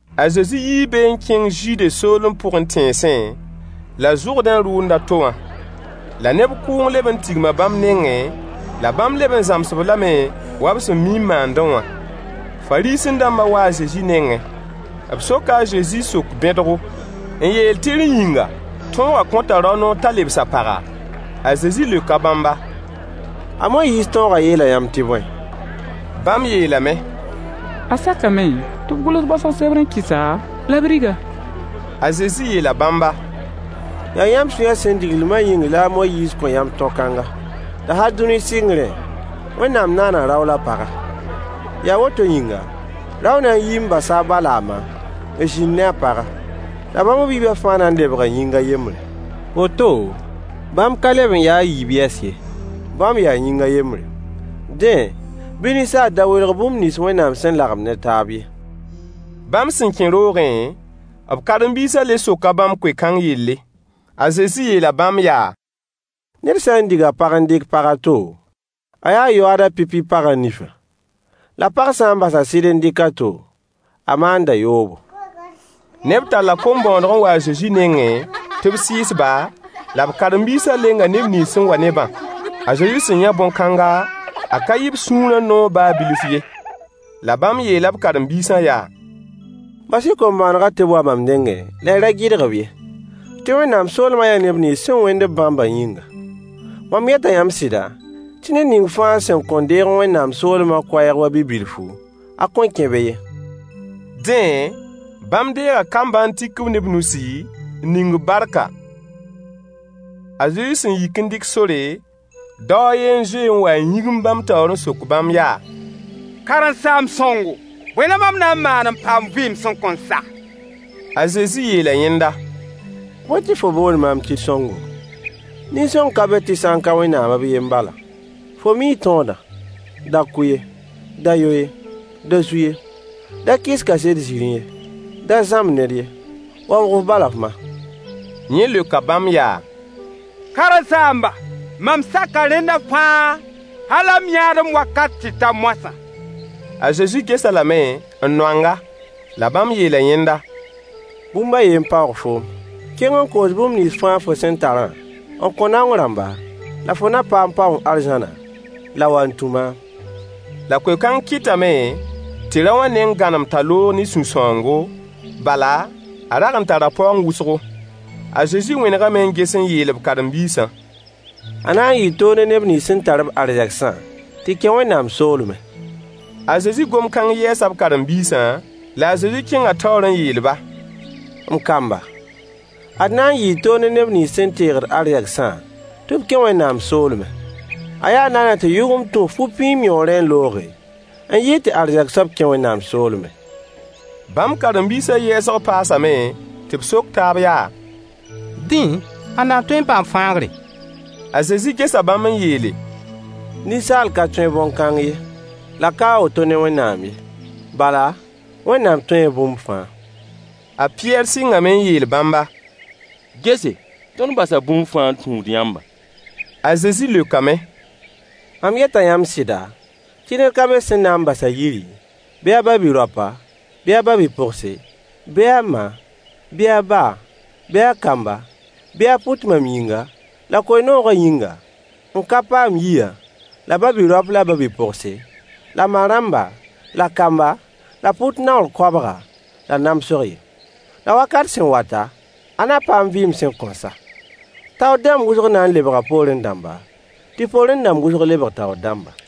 A Zezi yii be n kẽng Zude soolem pʋgẽ tẽnsẽ, la Zʋrdẽ rʋʋnd a to wã. La neb kʋʋng leb n tigma bãmb nengẽ, la bãmb leb n zãms-b lame wa b sẽn mi n maandẽ wã. Fariisẽ-dãmbã waa a Zezi nengẽ. B soka a Zezi sok-bẽdgo, n yeel tɩ rẽ yĩnga tõogã kõta rao noor t'a lebs a paga? A Zezi leoka bãmba: A Moyiis tõogã yeela yãmb tɩ bõe? Bãmb yeelame: A sakame tɩ b gʋls baosg sebr n kɩs-a la b rig-a. A Zezi yeela bãmba: Yaa yãmb sũyã sẽn diglmã yĩng la a Moyiis kõ yãmb tõ-kãnga. La hal dũni sɩngrẽ, “Wẽnnaam naana rao la paga. Yaa woto yĩnga, rao na n yii n basa a ba la a ma, n zĩnd ne a paga. La bãmb b yiibã fãa na n lebga yĩng a yembre.” Woto, bãmb ka leb n ya a yiib yɛs ye, bãmb yaa yĩng a yembre. Dẽ, bɩ ninsaal da welg bũmb nins Wẽnnaam sẽn lagem ne taab ye. Bãmb sẽn kẽ roogẽ, b karen-biisã le soka bãmb koe-kãng yelle. A Zezi yeela bãmb yaa: Ned sã n dig a pag n dɩk pag a to, a yaa yoaad a pipi pagã nifẽ. La pag sã n bas a sɩd n dɩk a to, a maanda yoobo. Neb talla kom-bõoneg n wa a Zezi nengẽ tɩ b sɩɩs-ba, la b karen-biisã lenga neb nins sẽn wa-b ne-bã. A Zezi sẽn yã bõn-kãnga, a ka yɩ b sũurã noog baa bilf ye. La bãmb yeela b karen-biisã yaa: Bas-y kom-bõonegã tɩ b wa mam nengẽ la y ra gɩdg-b ye, tɩ Wẽnnaam soolmã yaa neb nins sẽn wẽnd-b bãmbã yĩnga. Mam yeta yãmb sɩda tɩ ned ning fãa sẽn kõn deeg Wẽnnaam soolmã koɛɛg wa bi-bilfu, a kõn kẽ be ye. Dẽ, bãmb deega kambã n tik-b ne b nusi, n ning-b barka. A Zezi sẽn yik n dɩk sore, dao a yen n zoe n wa n yĩgimd bãmb taoor n sok bãmb yaa: Karen-saamb sõngo, bõe la mam na n maan n paam vɩɩm sẽn kõn sa? A Zezi yeela yẽnda: Bõe tɩ fo boond maam tɩ sõngo? Nin-sõng ka be tɩ sã n ka Wẽnnaam b yen bala. Fo mii tõodã: “Da kʋ ye. Da yo ye. Da zu ye. Da kɩs kaset-zĩrĩ ye. Da zãmb ned ye. Waoog f ba la f ma.” Yẽ leoka bãmb yaa: Karen-saamba, mam saka rẽnda fãa hal m yãadem wakat tɩ ta moasã. A Zezi ges-a lame n noang-a. La bãmb yeela yẽnda: Bũmb a yen n paoog foom. Kẽng n koos bũmb nins fãa fo sẽn tarã n kõ naong rãmba, la fo na paam paoong arzãna, la wa n tũ maam. La koe-kãng kɩtame tɩ rao wã neng gãnem t'a loog ne sũ-sãoongo, bala, a rag n tara paoong wʋsgo. A Zezi wẽnegame n ges n yeel b karen-biisã: A na n yɩɩ toog ne neb nins sẽn tar-b arzegsã tɩ kẽ Wẽnnaam soolmẽ. A Zezi gom-kãng yɛɛsa b karen-biisã, la a Zezi kẽnga taoor n yeel-ba: M kamba, ad na n yɩɩ toog ne [neb nins sẽn teegd arzegsã] tɩ b kẽ Wẽnnaam soolmẽ. A yaa naana tɩ yʋgemd tũ fu-pĩim yõorẽ n looge, n yɩɩd tɩ arzɛk soab kẽ Wẽnnaam soolmẽ. Bãmb karen-biisã yɛɛsg paasame tɩ b sok taab yaa: Dẽ, ãnna n tõe n paam fãagre? A Zezi gesa bãmb n yeele: Ninsaal ka tõe bõn-kãng ye, la ka a woto ne Wẽnnaam ye. Bala, Wẽnnaam tõee bũmb fãa. A Pɩyɛɛr sɩngame n yeel bãmba: Gese, tõnd basa bũmba fãa n tũud yãmba. A Zezi leokame: Mam yeta yãmb sɩda, tɩ ned ka be sẽn na n bas a yiri, bɩ a ba-bi-raopa, bɩ a ba-bi-pogse, bɩ a ma, bɩ a ba, bɩ a kamba, bɩ a pʋt mam yĩnga la koe-noogã yĩnga, n ka paam yiyã, la ba-bi-raopa la ba-bi-pogse, la ma-rãmba, la kamba, la pʋt naoor koabga, la namsg ye. La wakat sẽn wata, a na paam vɩɩm sẽn kõn sa. Taoor rãmb wʋsg na n lebga poorẽ dãmba, tɩ poorẽ dãmb wʋsg lebg taoor dãmba.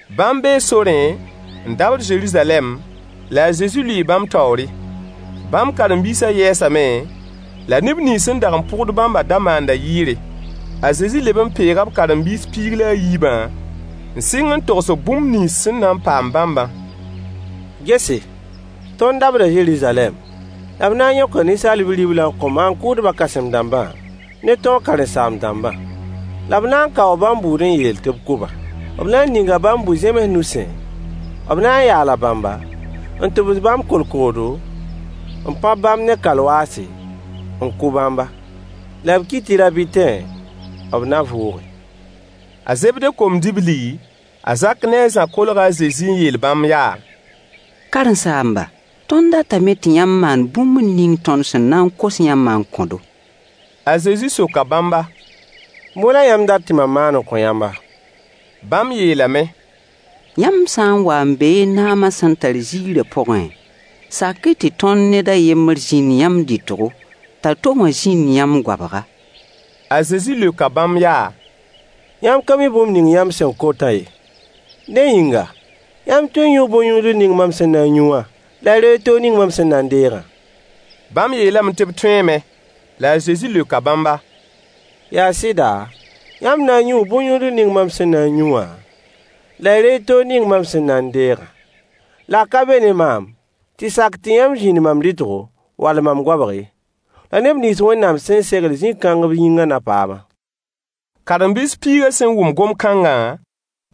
Bãmb bee sorẽ n dabd Zeruzalɛm, la a Zezi lʋɩɩ bãmb taoore. Bãmb karen-biisã yɛɛsame, la neb nins sẽn dag n pʋgd bãmbã da maanda yɩɩre. A Zezi leb n peega b karen-biis piig la a yiibã n sɩng n togs-b bũmb nins sẽn na n paam bãmbã. Gese, tõnd dabda Zeruzalɛm, la b na n yõka Ninsaal Bi-riblã n kõ maan-kʋʋdbã kãsem-dãmbã ne tõog karen-saam-dãmbã. La b na n kaoo bãmb bʋʋd n yeel tɩ b kʋ-ba. B na n ninga bãmb bu-zẽms nusẽ, b na n yaala bãmba, n tʋbs bãmb kolkoodo, n pãb bãmb ne kalwaase, n kʋ bãmba. La b ki tɩ rab tãtẽ, b na vʋʋge. A Zebde kom-dibli a Zak ne a Zã kolga a Zezi n yeel bãmb yaa: Karen-saamba, tõnd datame tɩ yãmb maan bũmb ning tõnd sẽn na n kos yãmbã n kõ-do. A Zezi soka bãmba: Bõe la yãmb dat tɩ mam maan n kõ yãmba? Bãmb yeelame: Yãmb sã n wa n be y naama sẽn tar ziirã pʋgẽ, sak-y tɩ tõnd ned a yembr zĩnd yãmb dɩtgo, t'a to wã zĩnd yãmb goabga. A Zezi leoka bãmb yaa: Yãmb ka mi bũmb ning yãmb sẽn kotã ye. Dẽ yĩnga, yãmb tõee n yũu bõn-yũudl ning mam sẽn na n yũ wã, la y reeg toog ning mam sẽn na n deegã? Bãmb yeelame tɩ b tõeeme! La a Zezi leoka bãmba: Yaa sɩda, yãmb na n yũu bõn-yũudl ning mam sẽn na n yũ wã, la y reeg toog ning mam sẽn na n deegã. La a ka be ne maam tɩ sak tɩ yãmb zĩnd mam dɩtgo wall mam goabg ye. La neb nins Wẽnnaam sẽn segl zĩ-kãng b yĩngã na paam-a. Karen-biis piigã sẽn wʋm gom-kãngã,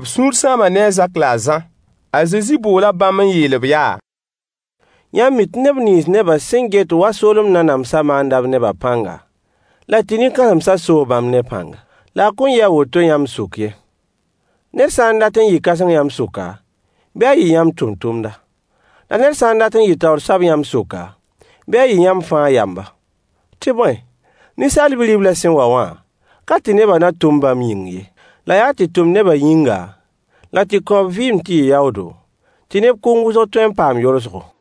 b sũur sãama ne a Zak la a Zã. A Zezi boola bãmb n yeel-b yaa: Yãmb mi tɩ neb nins nebã sẽn get wa soolem nanamsã maanda b nebã pãnga, la tɩ nin-kãsemsã soo bãmb ne pãnga. La a kõn yɩ a woto yãmb sʋk ye. Ned sã n dat n yɩ kãseng yãmb sʋka, bɩ a yɩ yãmb tʋmtʋmda. La ned sã n dat n yɩ taoor soab yãmb sʋka, bɩ a yɩ yãmb fãa yamba. Tɩ bõe, Ninsaal Bi-riblã sẽn wa wã, ka tɩ nebã na tʋm bãmb yĩng ye, la yaa tɩ tʋm nebã yĩnga, la tɩ kõ b vɩɩm tɩ yɩ yaoodo, tɩ neb kʋʋng wʋsg tõe n paam yolsgo.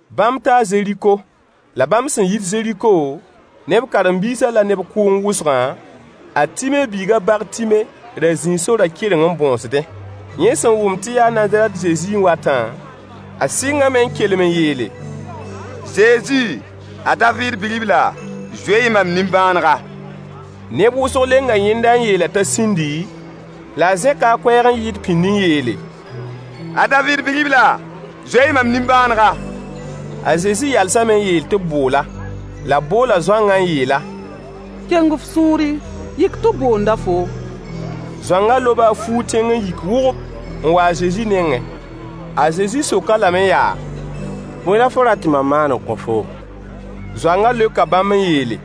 Bãmb taa Zeriko. La bãmb sẽn yit Zeriko ne b karen-biisã la neb kʋʋng wʋsgã, a Time biig a Bartime ra zĩi sorã kɩreng n bõosdẽ. Yẽ sẽn wʋm tɩ yaa Nazarɛt Zezi n watã, a sɩngame n kelem n yeele: Zezi! A Daviid Bi-ribla! Zoe-y mam nimbãanega. Neb wʋsg lenga yẽnda n yeel-a t'a sĩndi, la a zẽka a koɛɛg n yɩɩd pĩnd n yeele: A Daviid Bi-ribla, zoe-y mam nimbãanega! A Zezi yalsame n yeel tɩ b bool-a. La b boola zoangã n yeel-a: Keng f sũuri. Yik tɩ b boonda foom. Zoangã loba a fuug tẽng n yik wʋgʋp, n wa a Zezi nengẽ. A Zezi sok-a lame yaa: Bõe la fo rat tɩ mam maan n kõ foom? Zoangã leoka bãmb n yeele: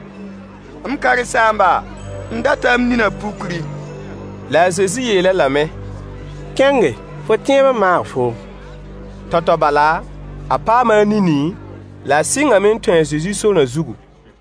M karen-saamba, m data m ninã pukri. La a Zezi yeel-a lame: Kẽnge! Fo tẽeb n maag foom. Tao-tao bala, a paama a nini, la a sɩngame n tũ a Zezi sorã zugu.